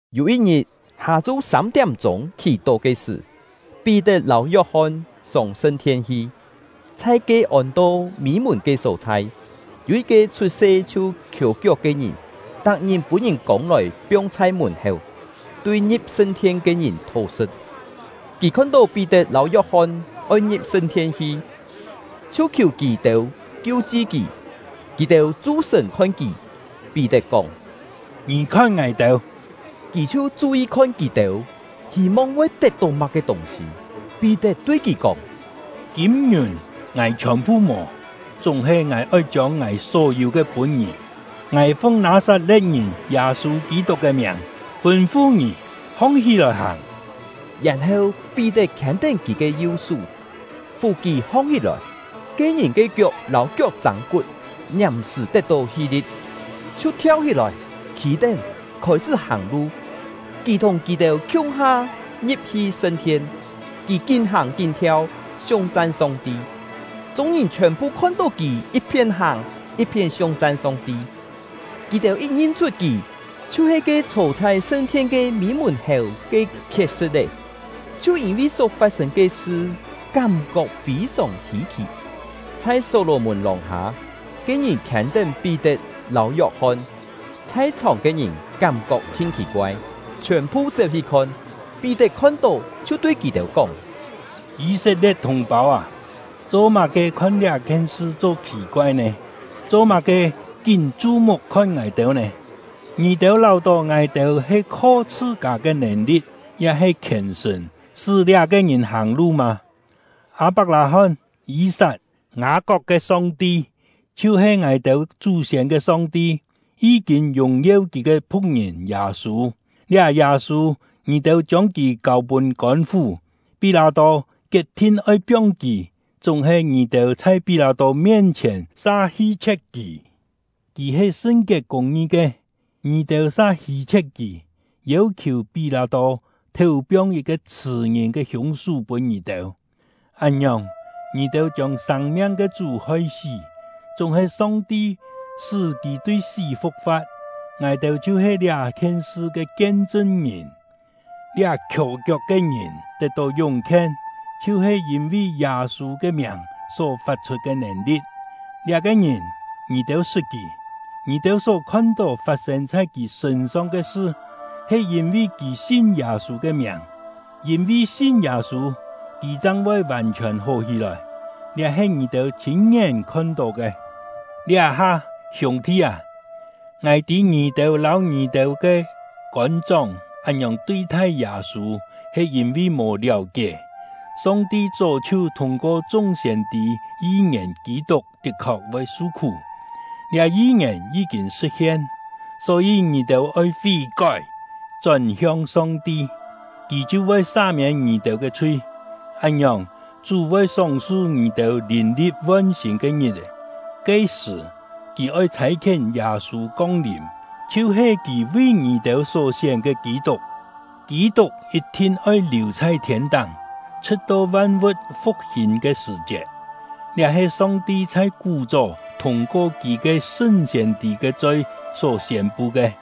Yû yit-ngit, hâ-chu sâm-tiám-chûng khì-tó ke sṳ̀, Pí-tet lâu Yok-hon sông sṳn-thien hi. Chhai ke ôn-to Mî-mùn ke só-chhai, yû yit-ke chhut-se chhiu khiò-kiok ke ngìn, tak-ngit pûn-ngìn kông-lòi piong chhai mùn-héu, tui ngi̍p sṳn-thien ke ngìn thó-sṳ̍t. Kì khon-tó Pí-tet lâu Yok-hon oi ngi̍p sṳn-thien hi, chhiu khiù kì-têu kiu-chi kì. Kì-têu chu-sṳ̀n khon kì; Pí-tet kóng: “Ngì khon ngài-têu!” Kì chhiu chu-yi khon kì-têu, hî-mong voi tet-tó má-ke tûng-sî. Pí-tet tui kì kóng: “Kîm-ngiùn ngài chhiòn-phu mò, chúng-he ngài oi chiông ngài só yû ke pûn ngì: Ngài fung Nâ-sat-le̍t-ngìn Yâ-sû Kî-tuk ke miàng fûn-fu ngì, hong-hí-lòi hàng!” Yèn-heu Pí-tet khiên-tén kì ke yu-sú, fù kì hong-hí-lòi. Ke ngìn ke kiok lâu kiok-châng-kut ngiàm-sṳ̀ tet-tó hi-li̍t, chhiu thiau-hí-lòi, khî-tén, khôi-sṳ́ hàng-lu. Kì thùng kì-têu khiung-ha ngi̍p-hi sṳn-thien; kì kín hàng kín thiau, siung-chan Song-ti. Chung-ngìn chhiòn-phu khon-tó kì yit-phién hàng, yit-phién siung-chan Song-ti; kì-têu yit ngin-chhut kì chhiu-he ke chhô chhai sṳn-thien ke Mî-mùn-héu ke khiet-sṳ̍t-é, chhiu yîn-vi só fat-sên ke sṳ kám-kok fî-sòng hî-khì. Chhai Só-lò-mùn lòng-hâ, ke ngìn khiên-tén Pí-tet lâu Yok-hon; chhai-chhòng ke ngìn kám-kok chhin khì-koai, chhiòn-phu chéu-hi khon. Pí-tet khon-tó, chhiu tui kì-têu kóng: “Yî-set-lie̍t thùng-pâu â, cho-má-ke khon liá-khien sṳ cho khì-koai nè? Cho-má-ke kín chu-muk khon ngài-têu nè? Ngì-têu láu-tó ngài-têu he kho chhṳ-kâ ke nèn-li̍t ya-he khièn-sṳ̀n sṳ́ liá-ke ngìn hàng-lu mâ? Â-pak-lâ-hón, Yî-sat, Ngâ-kok ke Song-ti, chhiu-he ngài-têu chú-siên ke Song-ti, yí-kîn yùng-yeu Kì ke phu̍k-ngìn Yâ-sû; liá Yâ-sû, ngì-têu chiông kì kâu pûn kôn-fú; Pí-lâ-tô kiet-thin oi piong kì, chúng-he ngì-têu chhai Pí-lâ-tô ke mien-chhièn sa hi-chhie̍t kì. Kì he sṳn-kiet kûng-ngi ke, ngì-têu sa hi-chhie̍t kì, yêu-khiù Pí-lâ-tô théu-piong yit-ke chhṳ̀-ngìn ke hiûng-sú pûn ngì-têu. Án-ngiòng, ngì-têu chiông sâng-miang ke Chú hoi-sí; chúng-he Song-ti sṳ́ kì tui sí fu̍k-fa̍t. Ngài-têu chhiu-he liá-khien sṳ ke kien-chṳn-ngìn. Liá khiò-kiok ke ngìn tet-tó yúng-khien, chhiu-he yîn-vi Yâ-sû ke miàng só fat-chhut ke nèn-li̍t. Liá-ke ngìn, ngì-têu sṳt kì. Ngì-têu só khon-tó fat-sên chhai kì sṳ̂n-song ke sṳ, he yîn-vi kì sin Yâ-sû ke miàng. Yîn-vi sin Yâ-sû, kì chang voi vàn-chhiòn hó hí-lòi; liá he ngì-têu chhîn-ngién khon-tó ke. “Liá-ha, hiûng-thi â, ngài tî ngì-têu lâu ngì-têu ke kôn-chóng án-ngiòng tui-thai Yâ-sû, he yîn-vi mò liáu-kié. Song-ti chó chhiu thûng-ko chung siên-tî yi-ngièn Kî-tuk tit-khok voi su-khú; liá yi-ngièn yí-kîn sṳ̍t-hien. Só-yî, ngì-têu oi fí-kói, chón-hiong Song-ti, Kì chhiu voi sa-miên ngì-têu ke chhui. Án-ngiòng, Chú voi sóng-su ngì-têu lìn-li̍t von-sîn ke ngit-è; ke-sṳ̀, Kì oi chhâi-khién Yâ-sû kong-lìm, chhiu-he Kì vi ngì-têu só-sién ke Kî-tuk. Kî-tuk yit-thin oi liù chhai thiên-táng, chhṳ̍t-to van-vu̍t fu̍k-hîn ke sṳ̀-chiet; liá he Song-ti chhai kú-chó thûng-ko Kì ke sṳn siên-tî ke choi só siên-pu ke.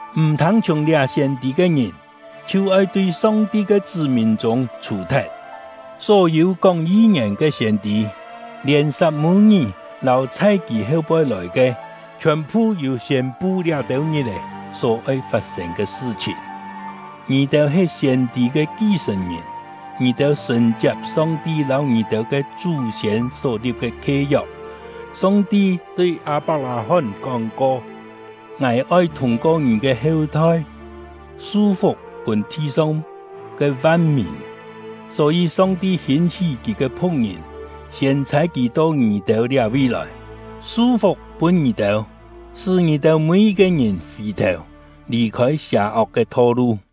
M̀ thâng-chhiùng liá siên-tî ke ngìn, chhiu oi tui Song-ti ke chṳ́-mìn chûng chhù-thet.’ Só-yû kóng yi-ngièn ke siên-tî, lièn Sat-mû-ngí lâu chhai kì heu-poi lòi ke, chhiòn-phu yû siên-pu liá-têu ngit-è só oi fat-sên ke sṳ-chhìn. Ngì-têu he siên-tî ke ki-sṳ̀n-ngìn; ngì-têu sṳ̀n-chiap Song-ti lâu ngì-têu ke chú-siên só-li̍p ke khie-yok. Song-ti tui Â-pak-lâ-hón kóng-ko: ‘Ngài oi thûng-ko ngì ke heu-thoi su-fuk pûn thi-song ke van-mìn.’ Só-yî, Song-ti hîn-hí Kì ke phu̍k-ngìn, siên chhâi kì to ngì-têu liá-vi lòi, su-fuk pûn ngì-têu, sṳ́ ngì-têu mî-yit-ke ngìn fì-thèu, lì-khôi sià-ok ke tho-lu.”